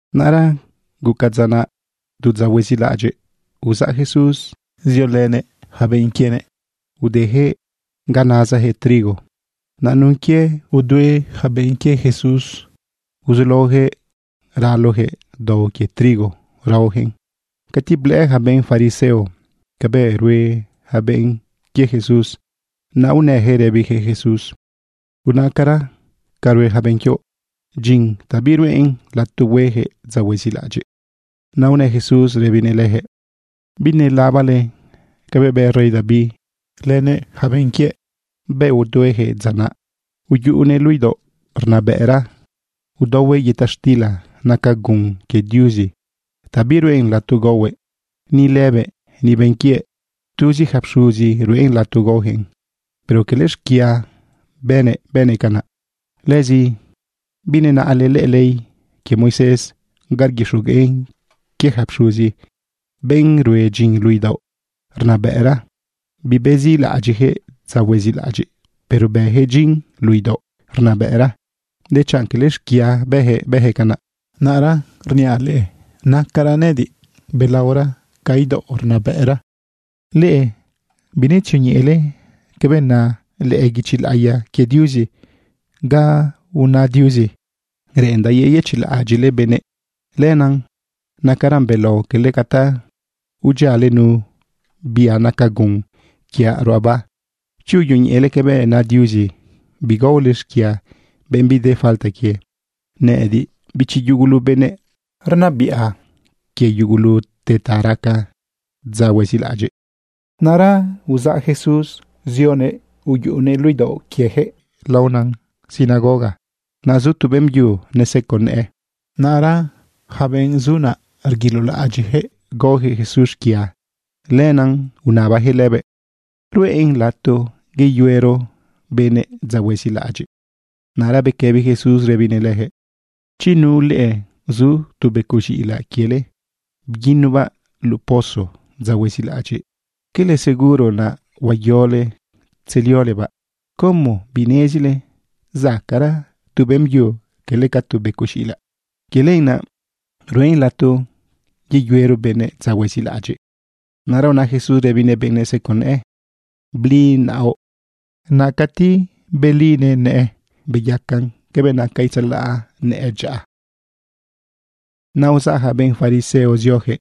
Naꞌra guca dza naꞌ tu dza huezilaꞌadyiꞌ, uzaꞌ Jesús ziolënëꞌ yaca benꞌ quienëꞌ udejëꞌ ga nazajëꞌ trigo. Naꞌ nun quie udue yaca benꞌ quie Jesús, sulaojëꞌ ralojëꞌ dao quie trigo raojëꞌn. Cati blëꞌë ja benꞌ fariseo cabëꞌ rue ja benꞌ quie Jesús, naꞌ unëjëꞌ rëbijëꞌ Jesús: ―Unaꞌcara, barue ja benꞌ quioꞌ dyin ta biruꞌen lato huejëꞌ dza huezilaꞌadyiꞌ. Naꞌ unë Jesús rëbinëꞌ lëjëꞌ: ―¿Binelabale cabëꞌ bë rey David lënëꞌ yaca benꞌ quiëꞌ bëꞌ uduejëꞌ dza naꞌ? Uyuꞌunëꞌ luꞌu idaoꞌ rnabëꞌra udaohuëꞌ yëta xtila naca gun quie Diuzi ta biruꞌen lato gaohuëꞌ, ni lëbëꞌ, ni benꞌ quiëꞌ. Tuzi ja pxuzizi ruꞌen lato gaojëꞌn. Pero cala xquia bënëꞌ, bënëꞌ canaꞌ. ¿Lëzi binenaꞌle lëꞌë ley quie Moisés ga rguixogueꞌn quie ja pxuzi, benꞌ rue dyin luꞌu idaoꞌ rnabëꞌra? Bibezilaꞌadyiꞌjëꞌ dza huezilaꞌadyiꞌ, pero bëjëꞌ dyin luꞌu idaoꞌ rnabëꞌra, dechanꞌ quele xquia bëjëꞌ, bëjëꞌ canaꞌ. Naꞌra rniaꞌ leꞌe, nacaraꞌ nëꞌëdiꞌ balaora ca idaoꞌ rnabëꞌra. Leꞌe binetzioñeꞌele cabëꞌ na lëꞌë guichi laꞌiya quie Diuzi ga una Diuzi: “Reꞌendaꞌ yeyëchiꞌlaꞌadyiꞌle benëꞌ. Lenaꞌ nacaran belao quele ca ta udyiale nu bia naca gun quiaꞌ ruꞌaba.” Chi uyoñeꞌele cabëꞌ na Diuzi, bigaole xquia benꞌ bide falta quie. Nëꞌëdiꞌ, bichi yugulu benëꞌ, rnabiꞌa quie yugulute ta raca dza huezilaꞌadyiꞌ. Naꞌra uzaꞌ Jesús zioguëꞌ uyuꞌunëꞌ luꞌu idaoꞌ quieyaquëꞌ laona sinagoga. Naꞌ zu tu beꞌmbyu neseco nëꞌë. Naꞌra yaca benꞌ zu naꞌ rguilolaꞌadyiꞌjëꞌ gaojëꞌ Jesús xquia. Lenaꞌ unabajëꞌ lëbëꞌ: ―¿Ruꞌen lato yeyuero benëꞌ dza huezilaꞌadyiꞌ? Naꞌra bequëbi Jesús rëbinëꞌ lëjëꞌ: ―¿Chi nu leꞌe zu tu becoꞌ z̃iꞌilaꞌ quiele bguinubaꞌ luꞌu pozo dza huezilaꞌadyiꞌ, quele seguro naꞌ huayole tzeliolebaꞌ? ¿Como binezile zacaꞌra tu beꞌmbyu quele ca tu becoꞌ z̃iꞌilaꞌ? Quie lenaꞌ ruꞌen lato yeyuero benëꞌ dza huezilaꞌadyiꞌ. Naꞌra una Jesús rëbinëꞌ benꞌ neseco nëꞌë: ―Bli naoꞌ. Naꞌ cati belinëꞌ nëꞌë, beyacan cabëꞌ naca itzalaꞌ nëꞌë dyaꞌa. Naꞌ uzaꞌ ja benꞌ fariseo ziojëꞌ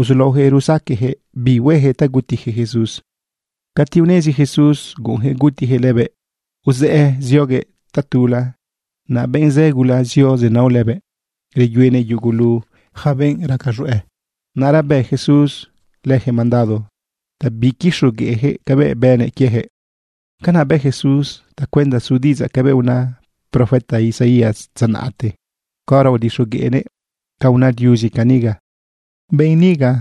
uzulaojëꞌ rusaqueꞌjëꞌ bi huejëꞌ ta gutijëꞌ Jesús. Cati unezi Jesús guꞌunjëꞌ gutijëꞌ lëbëꞌ, uzëꞌë zioguëꞌ tatula. Naꞌ benꞌ zë gula zio zenao lëbëꞌ. Reyuenëꞌ yugulu yaca benꞌ raca z̃hueꞌ. Naꞌra bë Jesús lëjëꞌ mandado ta biquixogueꞌjëꞌ cabëꞌ bënëꞌ quiejëꞌ. Canaꞌ bë Jesús tacuenda su diꞌidzaꞌ cabëꞌ una profeta Isaías dza naꞌte caora udixogueꞌnëꞌ ca una Diuzi caniga: Benꞌ niga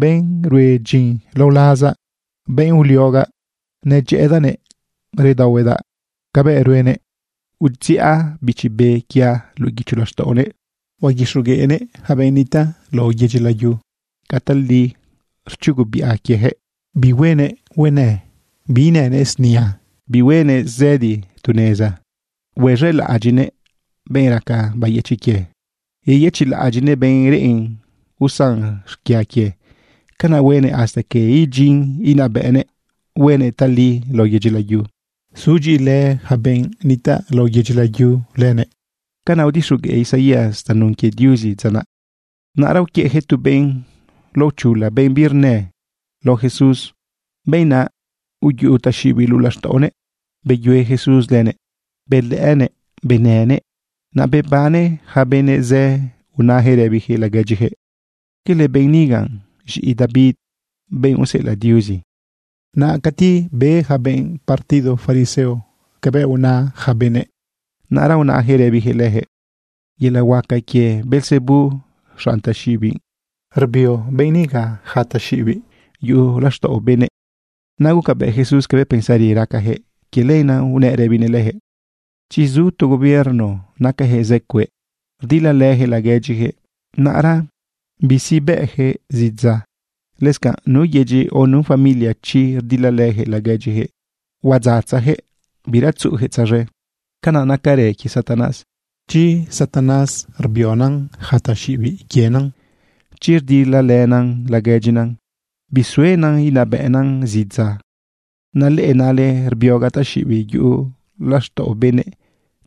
benꞌ rue dyin lao lazaꞌ, benꞌ uliogaꞌ, nedyëꞌëdaꞌnëꞌ redaohuedaꞌ cabëꞌ ruenëꞌ. Udziꞌa Bichi Be quiaꞌ luꞌu guicho laxtaꞌonëꞌ. Huaguixogueꞌnëꞌ yaca benꞌ nitaꞌ lao yedyi layu ca tali rchugubiꞌa quiejëꞌ. Bihuenëꞌ huenë, biinënëꞌ snia, bihuenëꞌ zëdi tu neza. Xelaꞌadyiꞌnëꞌ benꞌ raca bayëchiꞌ quie, yeyëchiꞌlaꞌadyiꞌnëꞌ benꞌ reꞌen usan xquia quie. Canaꞌ huenëꞌ hasta que idyinnëꞌ inabëꞌnëꞌ huenëꞌ tali lao yedyi layu. Sudyiꞌilë yaca benꞌ nitaꞌ lao yedyi layu lënëꞌ. Canaꞌ udixogueꞌ Isaías tanun quie Diuzi dza naꞌ. Naꞌra uquiëꞌjëꞌ tu benꞌ laochula, benꞌ birnë, lao Jesús. Benꞌ naꞌ uyuꞌu taxiꞌibiꞌ luꞌu laxtaꞌonëꞌ. Beyue Jesús lënëꞌ, belëꞌënëꞌ, benënëꞌ. Naꞌ bebane ja benꞌ zë unajëꞌ rëbijëꞌ laguedyijëꞌ: ―¿Quele benꞌ niga z̃iꞌi David, benꞌ useꞌelaꞌ Diuzi? Naꞌ cati be yaca benꞌ partido fariseo cabëꞌ una ja benëꞌ, naꞌra unajëꞌ rëbijëꞌ lëjëꞌ: ―Yelaꞌ huaca quie Beelzebú xanꞌ taxiꞌibiꞌ rbio benꞌ niga yaca taxiꞌibiꞌ yuꞌu laxtaꞌo benëꞌ. Naꞌ gucabëꞌ Jesús cabëꞌ pensari racajëꞌ. Quie lenaꞌ unëꞌ rëbinëꞌ lëjëꞌ: ―Chi zu tu gobierno nacajëꞌ zë cueꞌ rdilalëjëꞌ laguedyijëꞌ, naꞌra bisibëꞌjëꞌ zidza. Lëscanꞌ nu yedyi, o nu familia, chi rdilalëjëꞌ laguedyijëꞌ, huadzatzajëꞌ, bira tzuꞌujëꞌ tzaz̃e. Canaꞌ nacarën quie Satanás. Chi Satanás rbionan yaca taxiꞌibiꞌ quienan, chi rdilalënan laguedyinan, bisuenan inabëꞌnan zidza. Naꞌ leꞌe nale rbiogaꞌ taxiꞌibiꞌ yuꞌu laxtaꞌo benëꞌ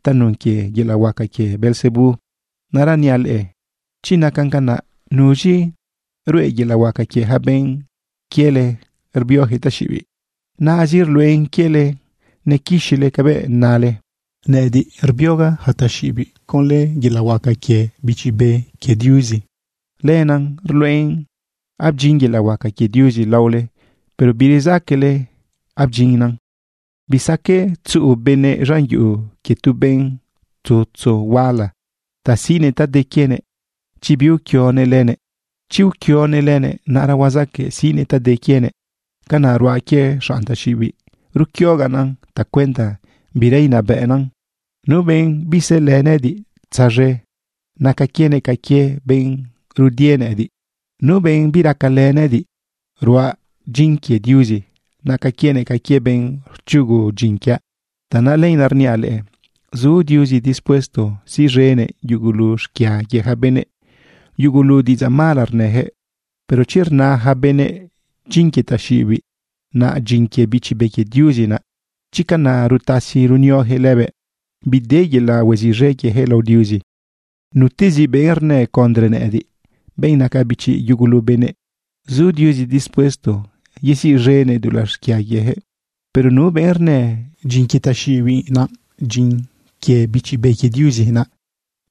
tanun quie yelaꞌ huaca quie Beelzebú. Naꞌra niaꞌ leꞌe chi nacan canaꞌ, ¿nuz̃i ruꞌe yelaꞌ huaca quie ja benꞌ quiele rbiojëꞌ taxiꞌibiꞌ? Naꞌzi ruluꞌen quiele nequixile cabëꞌ nale. Nëꞌëdiꞌ rbiogaꞌ yaca taxiꞌibiꞌ conlë yelaꞌ huaca quie Bichi Be quie Diuzi. Lenaꞌ ruluꞌen abdyin yelaꞌ huaca quie Diuzi laole, pero birezaquele abdyinnan. ’Bisaqueꞌ tzuꞌu benëꞌ z̃an yuꞌu quie tu benꞌ tzutzu huala ta siꞌnëꞌ ta de quienëꞌ chi biuquionëꞌ lënëꞌ. Chi uquionëꞌ lënëꞌ, naꞌra huazaqueꞌ siꞌnëꞌ ta de quienëꞌ. Canaꞌ ruaꞌ quie xanꞌ taxiꞌibiꞌ, ruquiogaꞌnan tacuenda bira inabëꞌnan. ’Nu benꞌ bizëlë nëꞌëdiꞌ tzaz̃e, naca quienëꞌ ca quie benꞌ rudie nëꞌëdiꞌ. Nu benꞌ biracalë nëꞌëdiꞌ ruaꞌ dyin quie Diuzi, naca quienëꞌ ca quie benꞌ rchugu dyin quiaꞌ. ’Tanaꞌ lenaꞌ rniaꞌ leꞌe, zu Diuzi dispuesto siꞌz̃enëꞌ yugulu xquia quie ja benëꞌ, yugulu diꞌidzaꞌ mala rnëjëꞌ, pero chi rna ja benëꞌ: “Dyin quie taxiꞌibiꞌ” naꞌ dyin quie Bichi Be quie Diuzi naꞌ, chi canaꞌ rutasi runiojëꞌ lëbëꞌ, bide yelaꞌ huaziꞌz̃e quiejëꞌ lao Diuzi. Nutezi benꞌ rnë condre nëꞌëdiꞌ, benꞌ naca bichi yugulu benëꞌ, zu Diuzi dispuesto yeziꞌz̃enëꞌ dulaꞌ xquia quiejëꞌ. Pero nu benꞌ rnë: “Dyin quie taxiꞌibiꞌ” naꞌ dyin quie Bichi Be quie Diuzi naꞌ,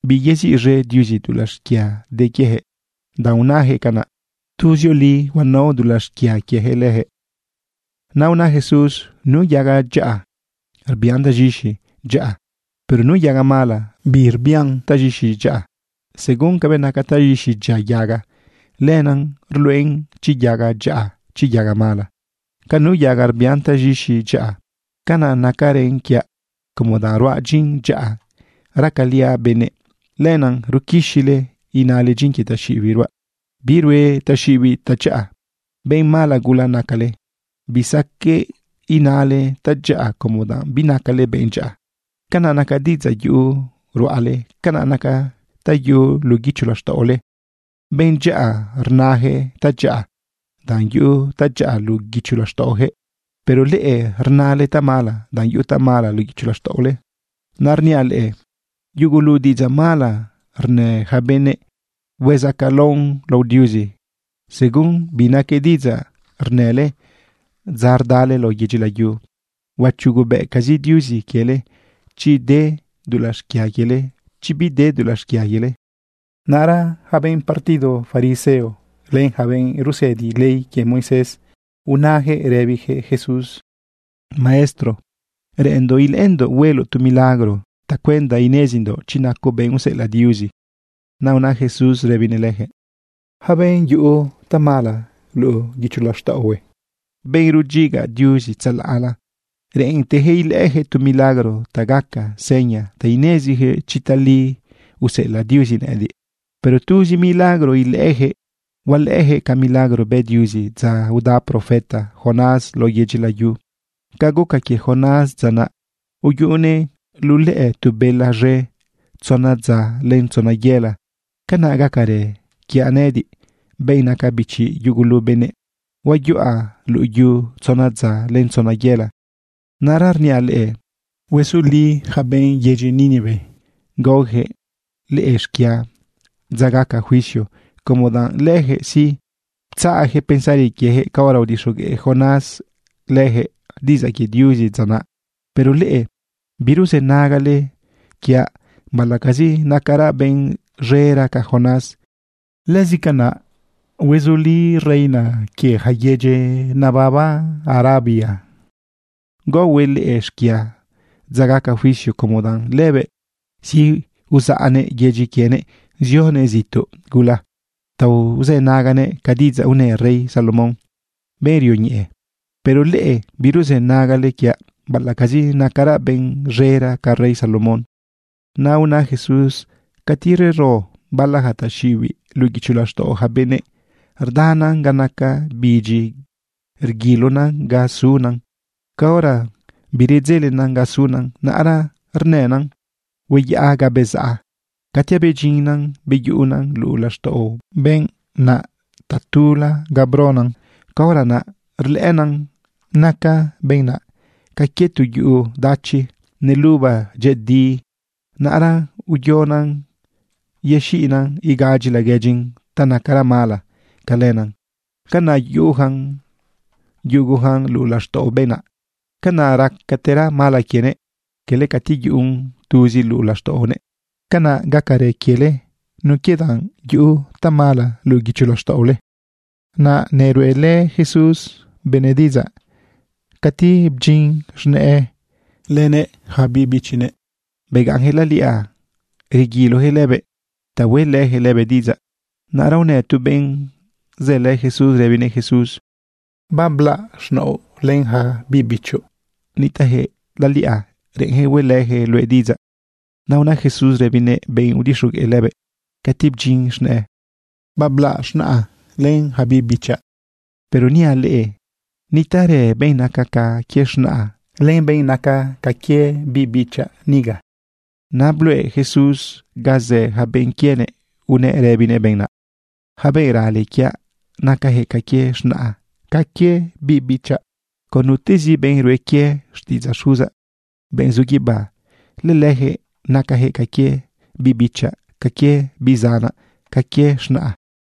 biyeziꞌz̃e Diuzi dulaꞌ xquia de quiejëꞌ danꞌ unajëꞌ canaꞌ. Tuzioli huanao dulaꞌ xquia quiejëꞌ lëjëꞌ. Naꞌ una Jesús: ―Nu yaga dyaꞌa rbian taz̃ixi dyaꞌa, pero nu yaga mala birbian taz̃ixi dyaꞌa. Según cabëꞌ naca taz̃ixi dyia yaga, lenaꞌ rluꞌen chi yaga dyaꞌa, chi yaga mala. Ca nu yaga rbian taz̃ixi dyaꞌa, canaꞌ nacarën quiaꞌ como danꞌ ruaꞌ dyin dyaꞌa racaliaꞌ benëꞌ. Lenaꞌ ruquixile inale dyin quie taxiꞌibiꞌ ruaꞌ. Birue taxiꞌibiꞌ tadyaꞌa. ¡Benꞌ mala gula nacale! Bisaqueꞌ inale tadyaꞌa como danꞌ binacale benꞌ dyaꞌa. Ca naca diꞌidzaꞌ yuꞌu ruꞌale, canaꞌ nacan ta yuꞌu luꞌu guicho laxtaꞌole. Benꞌ dyaꞌa rnajëꞌ tadyaꞌa, danꞌ yuꞌu tadyaꞌa luꞌu guicho laxtaꞌojëꞌ. Pero leꞌe rnale tamala, danꞌ yuꞌu tamala luꞌu guicho laxtaꞌole. Naꞌra rniaꞌ leꞌe, yugulu diꞌidzaꞌ mala rnë ja benëꞌ, huezacaꞌlaon lao Diuzi. Según bi naque diꞌidzaꞌ rnële dza rdale lao yedyi layu, huachugobëꞌcazi Diuzi quiele, chi de dulaꞌ xquia quiele, chi bide dulaꞌ xquia quiele. Naꞌra yaca benꞌ partido fariseo len yaca benꞌ rusëdi ley quie Moisés, unajëꞌ rëbijëꞌ Jesús: ―Maestro, reꞌenndoꞌ ilëꞌëndoꞌ hueloꞌ tu milagro tacuenda inezindoꞌ chi nacoꞌ benꞌ useꞌelaꞌ Diuzi. Naꞌ una Jesús rëbinëꞌ lëjëꞌ: ―Yaca benꞌ yuꞌu tamala luꞌu guicho laxtaꞌohue, benꞌ rudyiga Diuzi tzalaꞌla, reꞌentejëꞌ ilëꞌëjëꞌ tu milagro ta gaca seña ta inezijëꞌ chi tali useꞌelaꞌ Diuzi nëꞌediꞌ. Pero tuzi milagro ilëꞌëjëꞌ, hualëꞌëjëꞌ ca milagro bë Diuzi dza uda profeta Jonás lao yedyi layu. Ca guca quie Jonás dza naꞌ, uyuꞌunëꞌ luꞌu lëꞌë tu bela z̃e tzona dza len tzona yela, canaꞌ gacarë quiaꞌ nëꞌëdiꞌ, benꞌ naca bichi yugulu benëꞌ. Huayuꞌa luꞌu yu tzona dza len tzona yela. Naꞌra rniaꞌ leꞌe, huezuli yaca benꞌ yedyi Nínive gaojëꞌ leꞌe xquia dza gaca juicio como danꞌ lëjëꞌ sí, ptzaꞌjëꞌ pensari quiejëꞌ caora udixogueꞌ Jonás lëjëꞌ diꞌidzaꞌ quie Diuzi dza naꞌ. Pero leꞌe, biruzënagale quiaꞌ baꞌalaꞌcazi nacaraꞌ benꞌ z̃era ca Jonás. Lëscanaꞌ huezuli reina quie yaca yedyi nebaba Arabia gaohuëꞌ leꞌe xquia dza gaca juicio como danꞌ lëbëꞌ sí, uzaꞌnëꞌ yedyi quienëꞌ zionëꞌ zituꞌ gula ta uzënaguëꞌ ca diꞌidzaꞌ unë rey Salomón, benꞌ rioñeꞌe. Pero leꞌe, biruzënagale quiaꞌ baꞌalaꞌcazi nacaraꞌ benꞌ z̃era ca rey Salomón. Naꞌ una Jesús: ―Cati rero bala ja taxiꞌibiꞌ luꞌu guicho laxtaꞌo ja benëꞌ, rdana ga naca bidyi rguilona ga suna. Caora biredzelena ga suna, naꞌra rnëna: “Hueyaꞌa ga bezaꞌa.” Cati abedyinnan beyuꞌunan luꞌu laxtaꞌo benꞌ naꞌ tatula ganꞌ bronan, caora naꞌ rlëꞌëna naca benꞌ naꞌ ca quie tu yuꞌu dachi neluba dyëꞌëdi. Naꞌra uyonan yexiꞌnan igadyi laguedyin ta nacara mala ca lëna. Canaꞌ yuꞌujan yugujan luꞌu laxtaꞌo benꞌ naꞌ. Canaꞌ racatera mala quienëꞌ quele cati yuꞌun tuzin luꞌu laxtaꞌonëꞌ. Canaꞌ gacarë quiele nun quie danꞌ yuꞌu tamala luꞌu guicho laxtaꞌole. Naꞌ neruꞌelë Jesús benëꞌ diꞌidzaꞌ cati bdyin z̃nëꞌë lënëꞌ yaca biꞌ bichinëꞌ. Begaꞌnjëꞌ laliꞌa reguilojëꞌ lëbëꞌ ta hueꞌlëjëꞌ lëbëꞌ diꞌidzaꞌ. Naꞌra unë tu benꞌ zëlë Jesús rëbinëꞌ Jesús: ―Bablaꞌ z̃naoꞌ len ja biꞌ bichoꞌ. Nitaꞌjëꞌ laliꞌa, reꞌenjëꞌ hueꞌlëjëꞌ luëꞌ diꞌidzaꞌ. Naꞌ una Jesús rëbinëꞌ benꞌ udixogueꞌ lëbëꞌ cati bdyin z̃nëꞌë: ―Bablaꞌ z̃naꞌa len ja biꞌ bichaꞌ. Pero niaꞌ leꞌe, nitaꞌrë benꞌ naca ca quie z̃naꞌa, len benꞌ naca ca quie biꞌ bichaꞌ niga. Naꞌ bluꞌe Jesús ganꞌ zë ja benꞌ quienëꞌ unëꞌ rëbinëꞌ benꞌ naꞌ: ―Ja benꞌ rale quiaꞌ, nacajëꞌ ca quie z̃naꞌa, ca quie biꞌ bichaꞌ. Con nutezi benꞌ rue quie xtiꞌidzaꞌ Xuzaꞌ, benꞌ zu guibá, lëlëjëꞌ nacajëꞌ ca quie biꞌbichaꞌ, ca quie biꞌ zanaꞌ, ca quie z̃naꞌa.